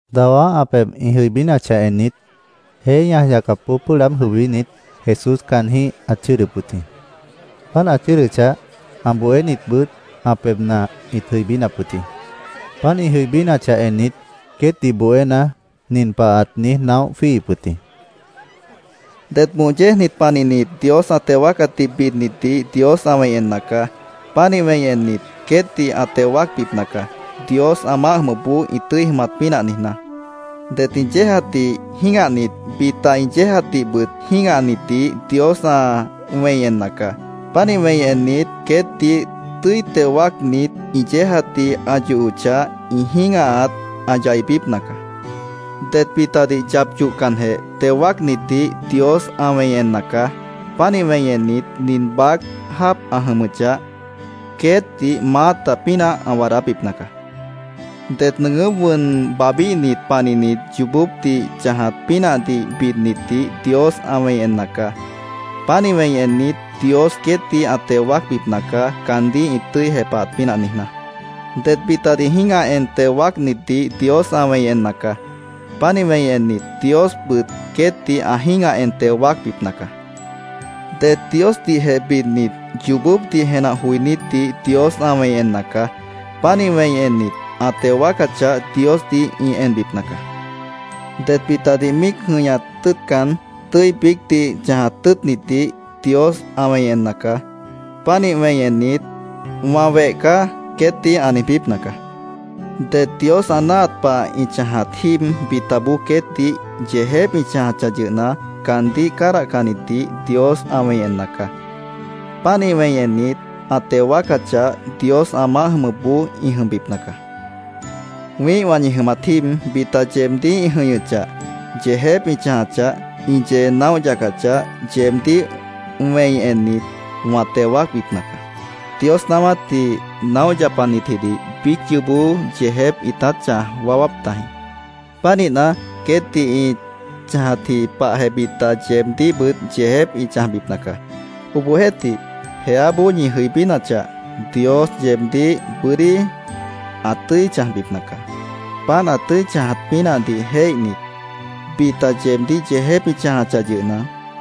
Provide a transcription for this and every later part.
Dawá ã pebh ĩ jʉibínachah ennit, jeé ñaj yacapboó pʉ́ʉh laáb jʉibínit, Jesús caanjĩ́h ãt chʉ́ʉdʉp wʉt jĩ. Páant ã chʉ́ʉdʉchah, ã bohénitbʉt ã pebhna ĩt jʉibínap wʉt jĩ. Páant ĩ jʉibínachah ennit, queétdih bohéna, nin pah ãt niíj naóh jwíihip wʉt jĩ: “Det moh yéejnit panihnit Dios ã teo wáacatdih bidnitdih Dios ã wẽi enna caá. Pánih wẽi ennit, queétdih ã teo wáacbipna caá, Dios ã maáh jʉmʉpboó ĩ tʉ́i jʉmat pínah niijná. “Det ĩ yéejatdih jĩ́gahnit, bita ĩ yéejatdihbʉt jĩ́gahnitdih Dios ã wẽi enna caá. Pánih wẽi ennit, queétdih tʉ́i teo wáacnit, ĩ yéejatdih ã yohochah, ĩ jĩ́gahat ã yaibípna caá. “Det bitadih yap yohcanjeh teo wáacnitdih Dios ã wẽi enna caá. Pánih wẽi ennit, nin baác jáap ã jʉmʉchah, queétdih maáta pínah ã waadábipna caá. “Det nʉʉgʉ́p wʉn babhbíhnit panihnit yoobópdih chãjat pínahdih bidnitdih Dios ã wẽi enna caá. Pánih wẽi ennit, Dios queétdih ã teo wáacbipna caá, caandíh ĩ tʉ́i jepahat pínah niijná. “Det bitadih jĩ́gah en teo wáacnitdih Dios ã wẽi enna caá. Pánih wẽi ennit, Diosbʉt queétdih ã jĩ́gah en teo wáacbipna caá. “Det Diosdihjeh bidnit, yoobópdih jenah joinítdih Dios ã wẽi enna caá. Pánih wẽi ennit, ã teo wáacachah, Diosdih ĩ enbipna caá. “Det bitadih míic jʉ̃ihñat tʉ́ʉtcan, tʉ́i biícdih chãjat tʉ́ʉtnitdih Dios ã wẽi enna caá. Pánih wẽi ennit, ‘Wã weh caá’, queétdih ã niijbípna caá. “Det Dios ã náahat pah ĩ chãjat jíib bitaboó queétdih yeejép ĩ chãjachah yʉhna, caandíh cádahcannitdih Dios ã wẽi enna caá. Pánih wẽi ennit, ã teo wáacachah, Dios ã maáh jʉmʉpboó ĩ jʉmbipna caá. “Wĩ́ihwã ñi jʉmat jíib bita yeebdíh ĩ jʉ̃ihñʉchah, yeejép ĩ chãjachah, ĩ yee naóh yacachah, yeebdíh wẽi ennit, wã teo wáacbipna caá. Dios naáwátdih naóh yapanitjidih biíc yoobó yeejép ĩtát chãj waáwáp tajĩ. Pánihna, queétdih ĩ chãjatji pahjeh bita yeebdíhbʉt yeejép ĩ chãjbipna caá. Obohjeéhtih, jeáboó ñi jʉibínachah, Dios yeebdíh bʉ́dí ã tʉ́i chãjbipna caá. Páant ã tʉ́i chãjat pínahdih jéihnit, bita yeebdíh yeejép ĩ chãjachah yʉhna,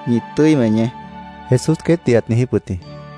ñi tʉ́i weñeé”, Jesús queétdih ãt niijíp wʉt jĩ.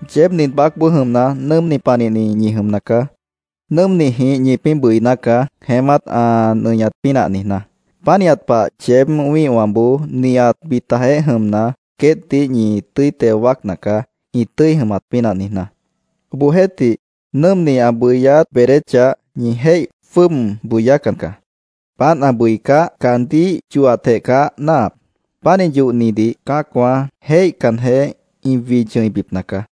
“Yeéb nin baácboó jʉmna, nʉ́ʉmni panihni ñi jʉmna caá. Nʉ́ʉmnijĩh ñipĩ́ bʉiná caá, jeémát ã nʉñat pínah niijná. Pánihat pah yeéb wĩ́ihwãboó nihat bitajeéh jʉmna, queétdih ñi tʉ́i teo wáacna caá, ĩ tʉ́i jʉmat pínah niijná. Obohjeéhtih, nʉ́ʉmni ã bʉyát beedéchah, ñi jéih jwʉ́ʉb bʉyácan caá. Páant ã bʉicáh, caandíh yohatjeh caá náahap. Pánih yohnidih cã́acwã jéihcanjeh, ĩ wid chʉ̃ibipna caá.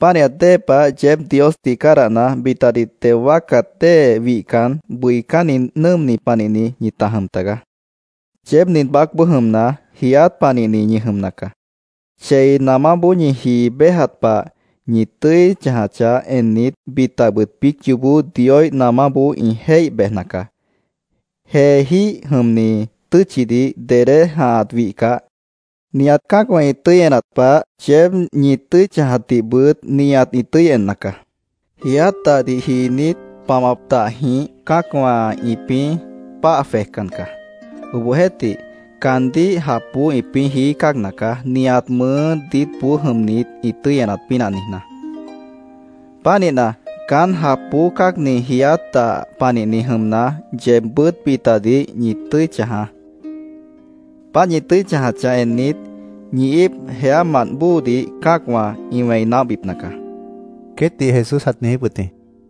Pánihat dée pah yeéb Diosdih cádahna, bitadih teo wáacat dée wihcan, bʉicánni nʉ́ʉmni panihni ñita jʉm tagaá. “Yeéb nin baácboó jʉmna, jiiát panihni ñi jʉmna caá. Chei namáboó ñi jii béjat pah, ñi tʉ́i chãjachah ennit, bitabʉt biíc yoobó Dioíh namáboó ĩ jéih bejna caá. Jeejíh jʉmni tʉ́tchidih dedé jãhat wihcah, nihat cã́acwã ĩ tʉ́i enat pah, yeéb ñi tʉ́i chãjatdihbʉt nihat ĩ tʉ́i enna caá. Jiiát dahdih jiinít, pamap dahjĩh cã́acwã ĩpĩ́ páah jwejcan caá. Obohjeéhtih, caandíh japboó ĩpĩ́ jií cáagna caá, nihat mʉʉ́ diítboó jʉmnit ĩ tʉ́i enat pínah niijná. Pánihna, caán japboó cáagni jiiát dah panihni jʉmna, yeebbʉ́t bitadih ñi tʉ́i chãjaá. Páant ñi tʉ́i chãjachah ennit, ñi íip jeámant bóodih cã́acwã ĩ wẽi naóhbipna caá”, queétdih Jesús ãt niijíp wʉt jĩ.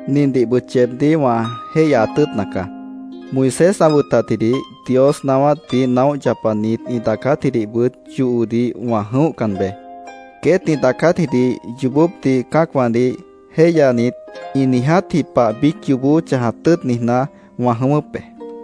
“Nindihbʉt yeebdíh wã jéihyaat tʉ́ʉtna caá: Moisés ã wʉtatjidih, Dios naáwátdih naóh yapanit ĩ daacátjidihbʉt yohodih wã jʉ̃óhcan beé. Queét ĩ daacátjidih yoobópdih cã́acwãdih jéihyanit, ĩ niijátji pah biíc yoobó chãjat tʉ́ʉt niijná, wã jʉ̃ʉ́wʉ́p be.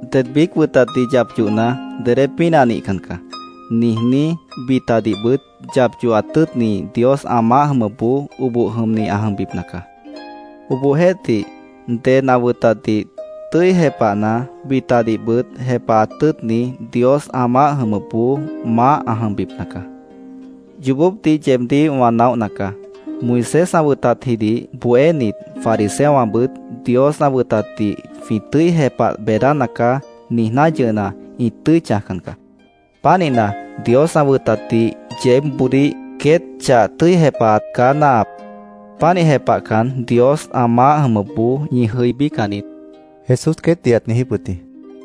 Ded biíc wʉtatdih yap yohna, ‘Dedé pínah nihcan caá’, niijní, bitadihbʉt yap yohat tʉ́ʉtni, Dios ã maáh jʉmʉpboó oboh jʉmni ã jʉmbipna caá. Obohjeéhtih, ded ã wʉtatdih tʉ́i jepahna, bitadihbʉt jepahat tʉ́ʉtni, Dios ã maáh jʉmʉpboó maáh ã jʉmbipna caá. Yoobópdih yeebdíh wã naóhna caá. Moisés ã wʉtatjidih bohénit, fariseowãbʉt ‘Dios ã wʉtatdih jwĩ tʉ́i jepah beedána caá’, niijná yʉhna, ĩ tʉ́i chãjcan caá. Pánihna, Dios ã wʉtatdih yeébboodíh queét chah tʉ́i jepahat caá náahap. Pánih jepahcan, Dios ã maáh jʉmʉpboó ñi jʉibícan niít”, Jesús queétdih ãt niijíp wʉt jĩ.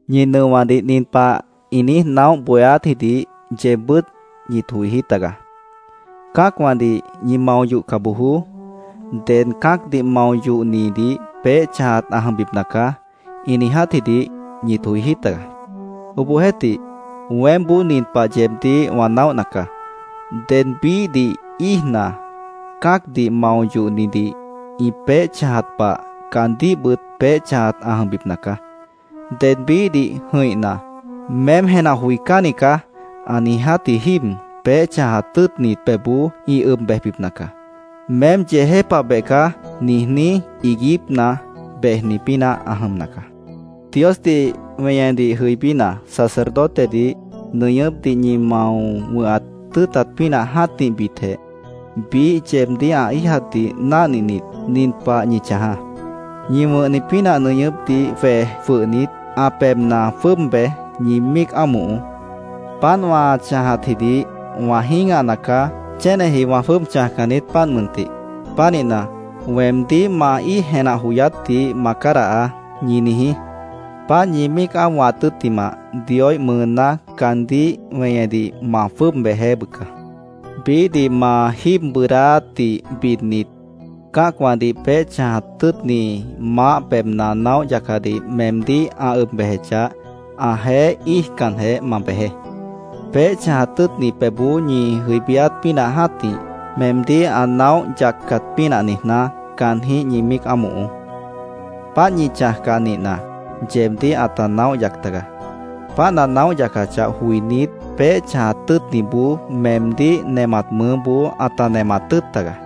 “Ñi nʉowãdih nin pah ĩ niíj naóh bohéátjidih yeebbʉ́t ñit joijí tagaá: ‘Cã́acwãdih ñi mao yohca bojoó. Ded cã́acdih mao yohnidih peéh chãjat ã jʉmbipna caá’, ĩ niijátjidih ñit joijí tagaá. Obohjeéhtih, weémboó nin pah yeebdíh wã naóhna caá: Ded biíhdih íijna, cã́acdih mao yohnidih ĩ peéh chãjat pah, caandíhbʉt peéh chãjat ã jʉmbipna caá. Ded biíhdih jʉ̃ihna ‘Meém jenah joicánni caá’, ã niijátji jíib, peéh chãjat tʉ́ʉtnit pebhboó ĩ ʉb bejbipna caá. ‘Meém yeejépabeh caá’, niijní iiguípna bejni pínah ã jʉmna caá. “Diosdih weñedih jʉibína, sacerdotedih nʉñʉ́pdih ñi mao wʉ̃hat tʉ́ʉtat pínah jã́tihbitjeh, biíh yeebdíh ã íijatdih náhninit, nin pah ñi chãjaá: Ñi wʉ̃hni pínah nʉñʉ́pdih jwej jwʉhnit, ã pebhna jwʉ́ʉb bej, ñi míic ámohoó. ‘Páant wã chãjatjidih wã jĩ́gahna caá. Chéneji wã jwʉ́ʉb chãjcan niít, páant mʉntih. Pánihna, weemdíh ma íij jenah joyátdih ma cádahaá’, ñi niijí. Páant ñi míic ámohat tʉ́ttimah, Dioíh mʉʉná caandíh weñedih ma jwʉ́ʉb bejeé, bʉca. “Biíhdih ma jíib bʉʉdáátdih bidnit, cã́acwãdih peéh chãjat tʉ́ʉtni maáh pebhna naóh yacadih meemdíh ã ʉb bejechah, ãjeéh íijcanjeh ma bejeé. Peéh chãjat tʉ́ʉtni pebhboó ñi jʉibíát pínah jã́tih, meemdíh ã naóh yaccat pínah niijná, caanjĩ́h ñi míic ámohoó. Páant ñi chãjcah nihna, yeebdíh ãta naóh yac tagaá. Páant ã naóh yacachah joinít, peéh chãjat tʉ́ʉtniboó meemdíh nemat mʉʉ́boó ãta nemat tʉ́ʉt tagaá.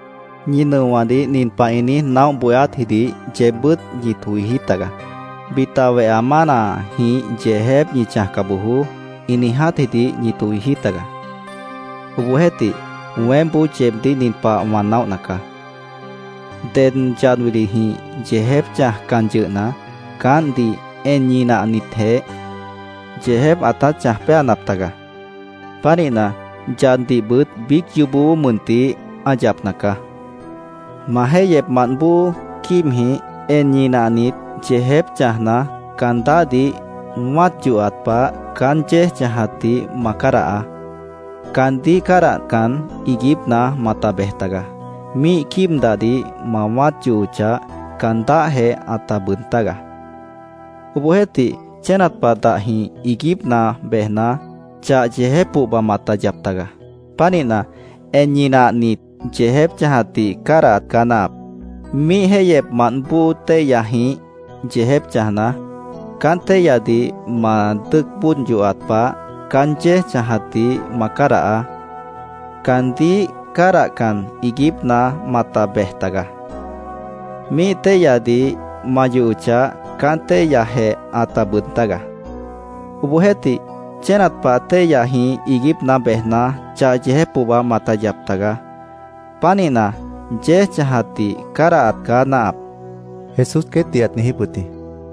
“Ñi nʉowãdih nin pah ĩ niíj naóh bohéátjidih yeebbʉ́t ñit joijí tagaá: ‘Bita weha mánajĩh yeejép ñi chãjca bojoó’, ĩ niijátjidih ñit joijí tagaá. Obohjeéhtih, weémboó yeebdíh nin pah wã naóhna caá: Ded yad wilijĩh yeejép chãjcan yʉhna, caántdih en ñinahnitjeh, yeejép ãtát chãj péanap taga. Pánihna, yaddihbʉt biíc yoobó mʉntih ã yapna caá. “Ma jéihyepmant bóo quíibjĩh en ñinahnit, yeejép chãjna, caan dáhdih wã́at yohat pah, caán yéej chãjatdih ma cádahaá. Caandíh cádahcan, iiguípna mata bej tagaá. Míih quíib dahdih ma wã́at yohochah, caan dáhjeh ãta bʉʉd tágaá. Obohjeéhtih, chénat pah dahjĩh iiguípna bejna, chah yeejép pohba mata yap tagaá. Pánihna, en ñinahnit, yeejép chãjatdih cádahat caá náahap. “Míih jéihyepmant bóo téihyajĩh yeejép chãjna, caán téihyadih ma dʉ́ʉc bóod yohat pah, caán yéej chãjatdih ma cádahaá. Caandíh cádahcan, iiguípna mata bej tagaá. Míih téihyadih ma yohochah, caán téihyajeh ãta bʉʉd tágaá. Obohjeéhtih, chénat pah téihyajĩh iiguípna bejna, chah yeejép pohba mata yap tagaá. Pánihna, yéej chãjatdih cádahat caá náahap”, Jesús queétdih ãt niijíp wʉt jĩ.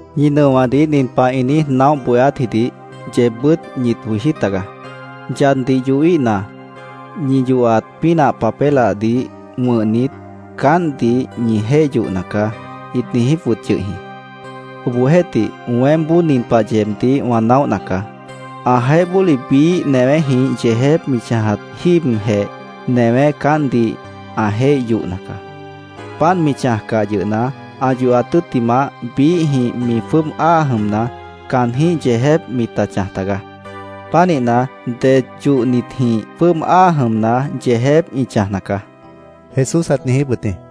“Ñi nʉowãdih nin pah ĩ niíj naóh bohéátjidih yeebbʉ́t ñit joijí tagaá: ‘Yaddih yohíhna, ñi yohat pínah papélahdih wʉ̃hnit, caántdih ñi jéih yohna caá’, ĩt niijíp wʉt yʉh jĩ. Obohjeéhtih, weémboó nin pah yeebdíh wã naóhna caá: Ãjeéh bóli biíh newéjĩh yeejép mi chãjat jíibjeh, newé caántdih ã jéih yohna caá. Páant mi chãjcah yʉhna, ã yohat tʉ́ttimah, biíhjĩh mi jwʉ́ʉb áa jʉmna, caanjĩ́h yeejép mita chãj tagaá. Pánihna, det yohnitjĩh jwʉ́ʉb áa jʉmna, yeejép ĩ chãjna caá”, Jesús ãt niijíp wʉt jĩ.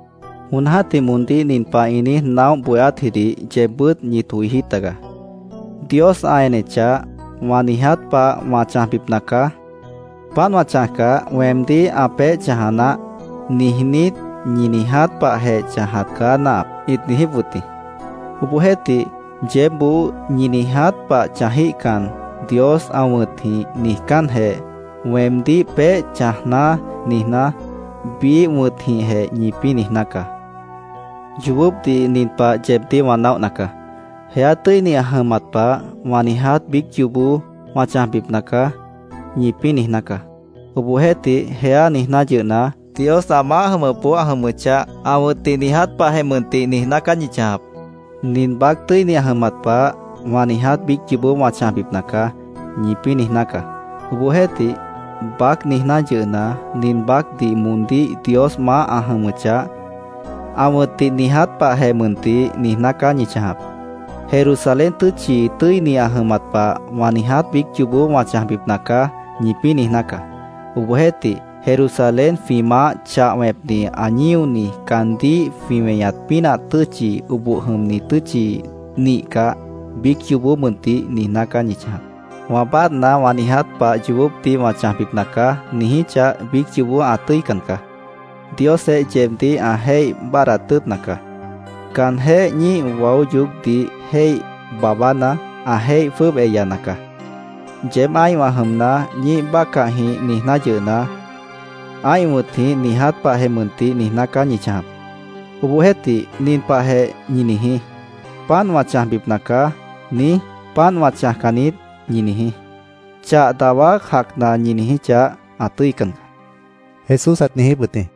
“Jon jã́tih moondíh nin pah ĩ niíj naóh bohéátjidih yeebbʉ́t ñit joijí tagaá: ‘ “Dios ã enechah, wã niiját pah wã chãjbipna caá. Páant wã chãjcah, weemdíh ã peéh chãja naáh”, niijnít, ñi niiját pahjeh chãjat caá náahap’, ĩt niijíp wʉt jĩ. Obohjeéhtih, yeébboó ñi niiját pah chãjíhcan, Dios ã wʉ̃tjĩh niijcánjeh, ‘weemdíh peéh chãjná’, niijná, biíh wʉ̃tjĩhjeh ñipĩ́ niijná caá. Yoobópdih nin pah yeebdíh wã naóhna caá: ‘Jeá tʉ́ini ã jʉmat pah, wã niiját biíc yoobó wã chãjbipna caá’, ñipĩ́ niijná caá. Obohjeéhtih, ‘jeá’, niijná yʉhna, Dios ã maáh jʉmʉpboó ã jʉmʉchah, ã wʉ̃tdih niiját pahjeh mʉntih niijná caá ñi chãjap. ‘Nin baác tʉ́ini ã jʉmat pah, wã niiját biíc yoobó wã chãjbipna caá’, ñipĩ́ niijná caá. Obohjeéhtih, ‘baác’, niijná yʉhna, nin baácdih moondíh Dios maáh ã jʉmʉchah, ã wʉ̃tdih niiját pahjeh mʉntih niijná caá ñi chãjap. ‘Jerusalén tʉ́tchi tʉ́ini ã jʉmat pah, wã niiját biíc yoobó wã chãjbipna caá’, ñipĩ́ niijná caá. Obohjeéhtih, Jerusalén jwĩ Maáh chah wẽpni ã ñíoni, caandíh jwĩ weñat pínah tʉ́tchi, oboh jʉmni tʉ́tchi nihcah, biíc yoobó mʉntih niijná caá ñi chãjap. ‘Wã báadhna, wã niiját pah yoobópdih wã chãjbipna caá’, ñi niijíchah, biíc yoobó ã tʉ́ican caá. Diosjeh yeebdíh ã jéih báadhdat tʉ́ʉtna caá. Caanjéh ñíih waó yoócdih jéih baabána, ã jéih jwʉ́ʉb eyana caá. Yeéb ã́ihwã jʉmna, ñíih bácahjĩh niijná yʉhna, ã́ih wʉ̃tjĩh niiját pahjeh mʉntih niijná caá ñi chãjap. Obohjeéhtih, nin pahjeh ñi niijí: ‘Páant wã chãjbip caá’, niíj, ‘Páant wã chãjcan niít’, ñi niijí. Chah dawá jacna ñi niijíchah, ã tʉ́ican caá”, Jesús ãt niijíp wʉt jĩ.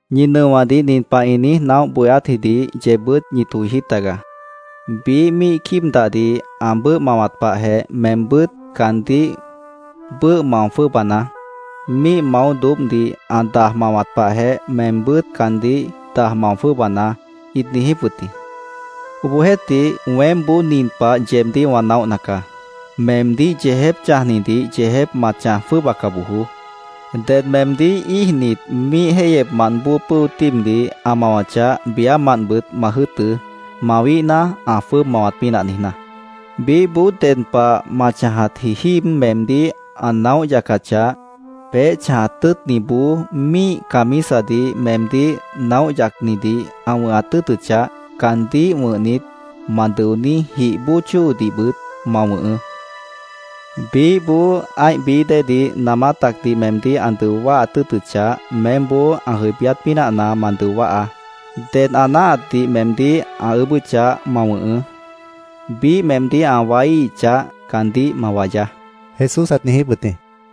“Ñi nʉowãdih nin pah ĩ niíj naóh bohéátjidih yeebbʉ́t ñit joijí tagaá. ‘Biíh míih quíib dahdih ã bʉ́ʉh mawat pahjeh, meembʉ́t caandíh bʉ́ʉh mao jwʉ́ʉbanaá. Míih maó doóbhdih ã daj mawat pahjeh, meembʉ́t caandíh daj mao jwʉ́ʉbanaá’, ĩt niijíp wʉt jĩ. Obohjeéhtih, weémboó nin pah yeebdíh wã naóhna caá: Meemdíh yeejép chãjnidih yeejép ma chãj jwʉ́ʉbaca bojoó. Ded meemdíh íijnit, míih jéihyepmant bóo pʉ́o tíibdih ã mawachah, biámantbʉt ma jʉ́ʉtʉ́, mawíhna, ã jwʉ́ʉb mawat pínah niijná. Biíhboó ded pah ma chãjatji jíib meemdíh ã naóh yacachah, peéh chãjat tʉ́ʉtniboó míih camisadih meemdíh naóh yacnidih ã wʉ̃hat tʉ́ʉtʉchah, caandíh wʉ̃hnit, ma dʉoní jih bóo chóodihbʉt ma wʉ̃hʉʉ́. Biíhboó ã́ih bií déedih namá tacdih meemdíh ã dʉo wáhat tʉ́ʉtʉchah, meémboó ã jʉibíát pínahna ma dʉo wáhaá. Ded ã náahatdih meemdíh ã ʉʉ́bʉ́chah, ma wʉ̃hʉʉ́. Biíh meemdíh ã waííhichah, caandíh ma wayaá”, Jesús ãt niijíp wʉt jĩ.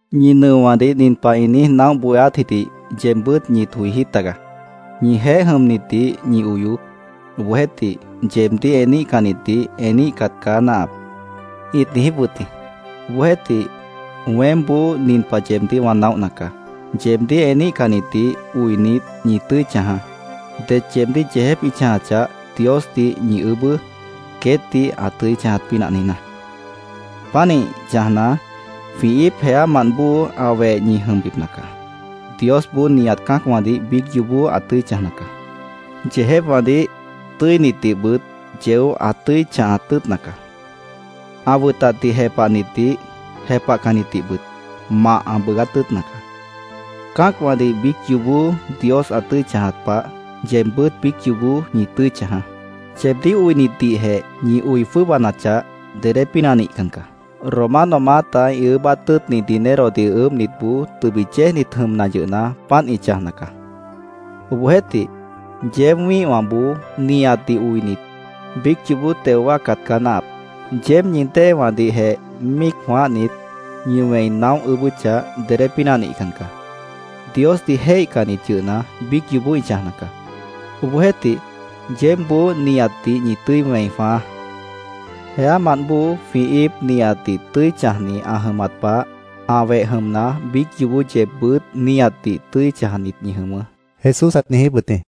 “Ñi nʉowãdih nin pah ĩ niíj naóh bohéátjidih yeebbʉ́t ñit joijí tagaá: ‘Ñijeéh jʉmnitdih ñi oyoó. Obohjeéhtih, yeebdíh eníhcannitdih eníhcat caá náahap’, ĩt niijíp wʉt jĩ. Obohjeéhtih, weémboó nin pah yeebdíh wã naóhna caá: Yeebdíh eníhcannitdih oinit, ñi tʉ́i chãjaá. Det yeebdíh yeejép ĩ chãjachah, Diosdih ñi ʉʉ́bʉ́, queétdih ã tʉ́i chãjat pínah niijná. Pánih chãjna, jwĩ íip jeámant bóo ã weh ñi jʉmbipna caá. Diosboó nihat cã́acwãdih biíc yoobó ã tʉ́i chãjna caá. Yeejépwãdih, tʉ́initdihbʉt yeó ã tʉ́i chãhat tʉ́ʉtna caá. Ã wʉtatdih jepahnitdih, jepahcannitdihbʉt mah ã bʉʉgát tʉ́ʉtna caá. Cã́acwãdih biíc yoobó Dios ã tʉ́i chãjat pah, yeebbʉ́t biíc yoobó ñi tʉ́i chãjaá. Yeebdíh oinitdihjeh ñi oi jwʉ́ʉbanachah, dedé pínah nihcan caá. Romano maáta ĩ ʉʉ́bát tʉ́ʉtni dinerodih ʉʉ́bhnitboó tʉbit yéejnit jʉmna yʉhna, páant ĩ chãjna caá. Obohjeéhtih, yeéb wĩ́ihwãboó nihatdih oinit, biíc yoobó teo wáacat caá náahap. Yeéb ñi déewãdihjeh míic jwãáhnit, ñi wẽi naóh ʉʉ́bʉ́chah, dedé pínah nihcan caá. Diosdih jéihcannit yʉhna, biíc yoobó ĩ chãjna caá. Obohjeéhtih, yeébboó nihatdih ñi tʉ́i wẽi jwãáá. Jeámant bóo jwĩ íip nihatdih tʉ́i chãjni ã jʉmat pah, ã weh jʉmna, biíc yoobó yeebbʉ́t nihatdih tʉ́i chãjnit ñi jʉmʉʉ́”, Jesús ãt niijíp wʉt jĩ.